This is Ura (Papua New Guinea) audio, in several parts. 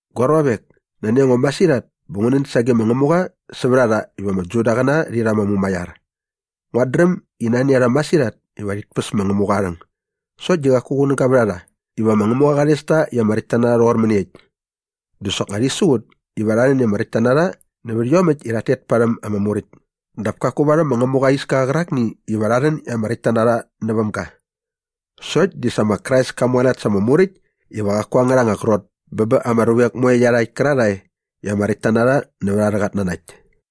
Gua ruavek, nani a ngo masirhat bä ngu nän sage ma Ngämuqa sävät a rha iva ama Judaqäna rhi rha ama mumaiar. Nguat dräm i nani a rha masirhat iva rhit päs ma Ngämuqa aa rhäng sokt di qaku qunäga vät a rha iva ma Ngämuqa qa rhes ta i ama räktta na rha rhoqor mäniekt. Dä soknga rhi siqut iva rha rhän i ama räktka na rha nävät iomäkt i rhat tet parhäm ama Muräkt dap kaku varhäm ma Ngämuqa aa iska qärakni iva rha rhän i ama räkt ta näväm ga. Sokt di sa ma Krais ka mualat sa ama Muräkt iva qaku angärha anga qrot bä bä ama ruvek moe iarhakt kärarhae i ama räktta na rha nävät arhä qatnanakt.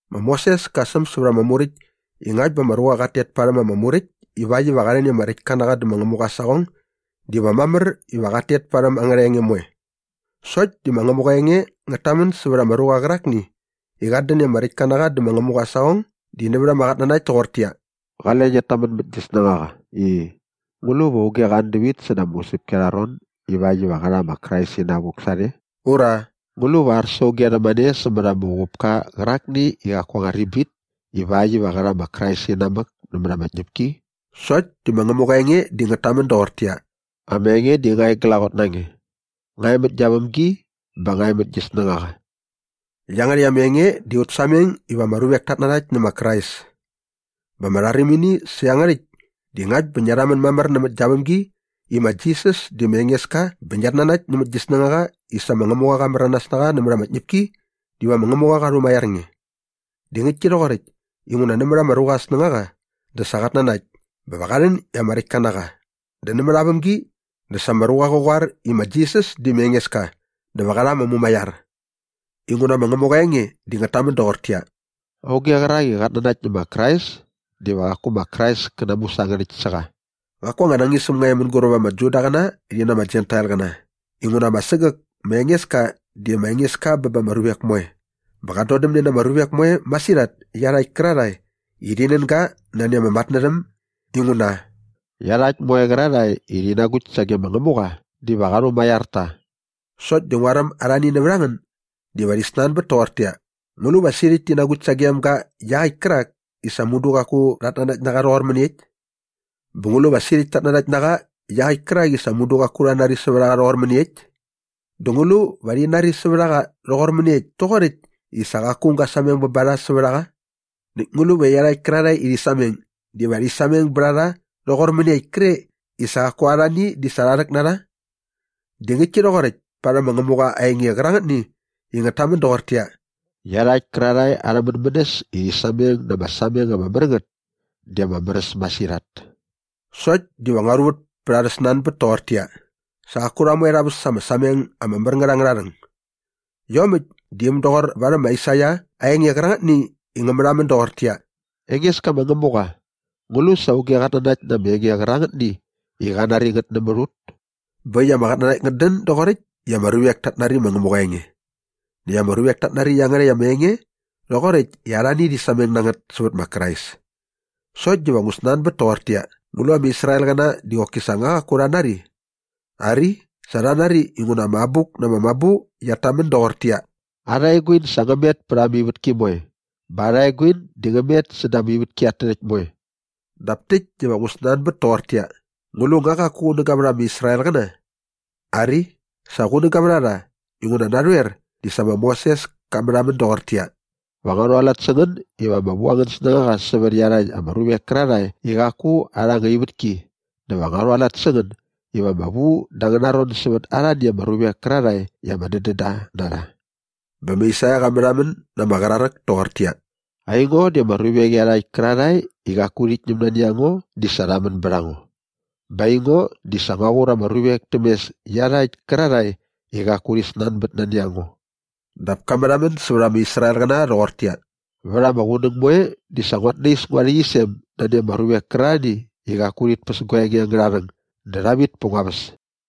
Ma Moses ka säm sävät ama Muräkt i ngakt bä ama ruqa qat tet parhäm ama Muräkt ivakt iva qa rhän i ama räktka na qa dä ma Ngämuqa aa saqong diva mamär iva qat tet parhäm angärha enge moe. Sokt di ma Ngämuqa aa enge ngät tamän sävät ama ruqa qärakni i qat dän i ama räktka na qa dä ma Ngämuqa aa saqong di nävät ama qatnanakt toqortäqyia, “Qale ngiat tamän mät gi snängaqa i, ‘Ngu lu va auge qa an dävit säda ama usäpki arha ron ivakt iva qä rha ma Krais inavuk sarhe?’” ura “‘Ngu lu va ar sa auge rhämane sämät ama uqupka qärakni i qaku aa anga ribit ivakt iva qä rha ma Krais inamäk nämät ama tñäpki?’” Sokt di ma Ngämuqa aa enge di ngät tamän doqortäqyia, “Ama enge di nga e glaqot na nge. Nga e mät gia vämgi bä nga e mät gi snängaqa.” Iangärhäkt ama enge di aut sameng iva ama ruvek tat nanakt nä ma Krais. Bä ama rharimini sä iangärhäkt di ngakt bä ngia rhamän mamär nämät gia vämgi i ma Jisas di ma Engeska bä ngiat nanakt nämät gi snängaqa i sa ma Ngämuqa qa märanas na qa nämät ama tñäpki diva ma Ngämuqa qa rhumaiar nge. Di ngäktki rhoqoräkt inguna nämät ama ruqa aa snängaqa dä sa qat nanakt bä va qa rhän i ama räktka na qa dä nämät aa vämgi dä sa ama ruqa qä qoar i ma Jisas di ma Engeska dä va qä rha ama mumaiar. Ma Ngämuqa aa enge di ngät tamän doqortäqyia, “Auge qärak i qat nanakt nä ma Krais diva qaku ma Krais kä namusangärhäkt sä qa.” Qaku anga nañisäm nga e mänguräp ama Judaqäna rhi na ama Jentailqäna inguna ama sägäk ma Engeska di ma Engeska bä ba ama ruvek moe bä qat dodämne na ama ruvek moe masirhat iarhakt kärarhae i rhi nän ga nani aa matnärhäm inguna “iarhakt moe qärarhae i rhi nagukt sage ma Ngämuqa diva qa rhumaiar ta.” Sokt di nguaräm arhani nävät a ngän diva rhi snanbät toqortäqyia, “Ngu lu va sirhäkt ti nagukt sagem ga iaqäkt kärak i sa mudu qaku rhat nanakt na qa rhoqor mäniekt? Bä ngu lu va sirhäkt tat nanakt na qa iaqäkt kärak i sa mudu qaku rha nari sävät a qa rhoqor mäniekt? Dä ngu lu va rhi nari sävät a qa rhoqor mäniekt toqoräkt i sa qaku aung ga sameng ba rha sävät a qa? Näkt ngu lu va iarhakt kärarhae iva rhi sameng diva rhi sameng bät a rha rhoqor mäniekt kre i sa qaku arhani di sa rha rhäk na rha?” Di ngäktki rhoqoräkt parhäm ma Ngämuqa aa enge qärangätni i ngät tamän doqortäqyia, “Iarhakt kärarhae arha mänmänäs i rhi sameng na ama sameng ama mär ngät di ama mär äs masirhat!” Sokt diva ngua rhuvät pät arhä snanbät toqortäqyia, sa qaku rha moe rha väs ama sameng ama mär ngät angärha rhäng. Iomäkt di äm doqor varhäm ma Aisaia aa enge qärangätni i ngä märhamän doqortäqyia, “Engeska ma Ngämuqa, ngu lu sa auge qat nanakt na ama enge qärangätni i qa nari ngät nämät ut?” Bä äkt i ama qatnanakt ngät dän doqoräkt i ama ruvek tat nari ma Ngämuqa aa enge. Näkt ama ruvek tat nari iangärhäkt ama enge rhoqoräkt i arhani rhi sameng na ngät sävät ma Krais. Sokt diva ngu snanbät toqortäqyia, ngu lu ama Israelqäna di qoki sa nga qaku rha nari? Ari, sa rha nari inguna ama Abuk na ama Mabu qiat tamän doqortäqyia, “Arha eguin sa ngä met pät ama ivätki moe bä arha eguin di ngä met säda ama ivätki at tärhäkt moe.” Dap täkt diva ngu snanbät toqortäqyia, ngu lu nga qaku qunäga vät ama Israelqäna? Ari, sa qunäga vät a rha inguna narhoer di sa ma Moses ka märhamän doqortäqyia, “Va ngua rhualat sä ngän iva ama vu angän snängaqa sävät iarhakt ama ruvek kärarhae i qaku arha anga ivätki dä va ngua rhualat sä ngän iva ama vu da angäna ron sävät arhani ama ruvek kärarhae i ama dädän da na rha.” Bä ma Aisaia qa märhamän na ama qraräk toqortäqyia, “Aingo di ama ruvek iarhakt kärarhae i qaku rhit ñäm nani a ngo di sa rha män bät a ngo bä aingo di sa ngua qur ama ruvek täm mes iarhakt kärarhae i qaku rhi snanbät nani a ngo.” Dap ka märhamän sävät ama Israelqäna rhoqortäqyia, “Vät ama qunäng moe di sa nguat nais ngua rhäqyisem nani ama ruvek kärarhani i qaku rhit päs gua enge angärha rhäng dä rha vit pät ngua väs.”